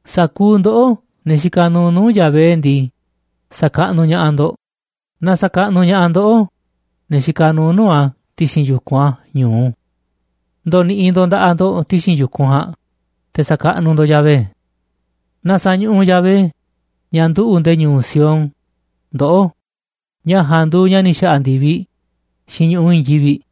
Sa̱kuuꞌ ndoꞌó, ne̱ xikaꞌ nuuꞌ nuu̱ꞌ Yahvé ndii, sa̱kaꞌnuꞌ ña̱ꞌaꞌ ndo̱ꞌ, na sa̱kaꞌnuꞌ ña̱ꞌaꞌ ndoꞌó, ne̱ xikaꞌ nuuꞌ nuu̱ꞌ a̱ ti̱xi̱n yu̱kunꞌ a̱ ñu̱u. Ndo̱ni̱ꞌi̱ ndo̱ꞌ nda̱ꞌaꞌ ndo̱ꞌ ti̱xi̱n yu̱kunꞌ ja̱a̱nꞌ, te̱ sa̱kaꞌnuꞌ ndo̱ꞌ Yahvé. Na sa̱ñuꞌuꞌ Yahvé, ña̱ nduꞌu̱ꞌ nde̱e̱ ñu̱u̱ Sión, ndoꞌó, ña̱ ja̱a̱nꞌ nduuꞌ ña̱ ni̱ xa̱ꞌa̱ ndi̱viꞌ xiinꞌ ñu̱ꞌuꞌ i̱i̱n yivi̱ꞌ.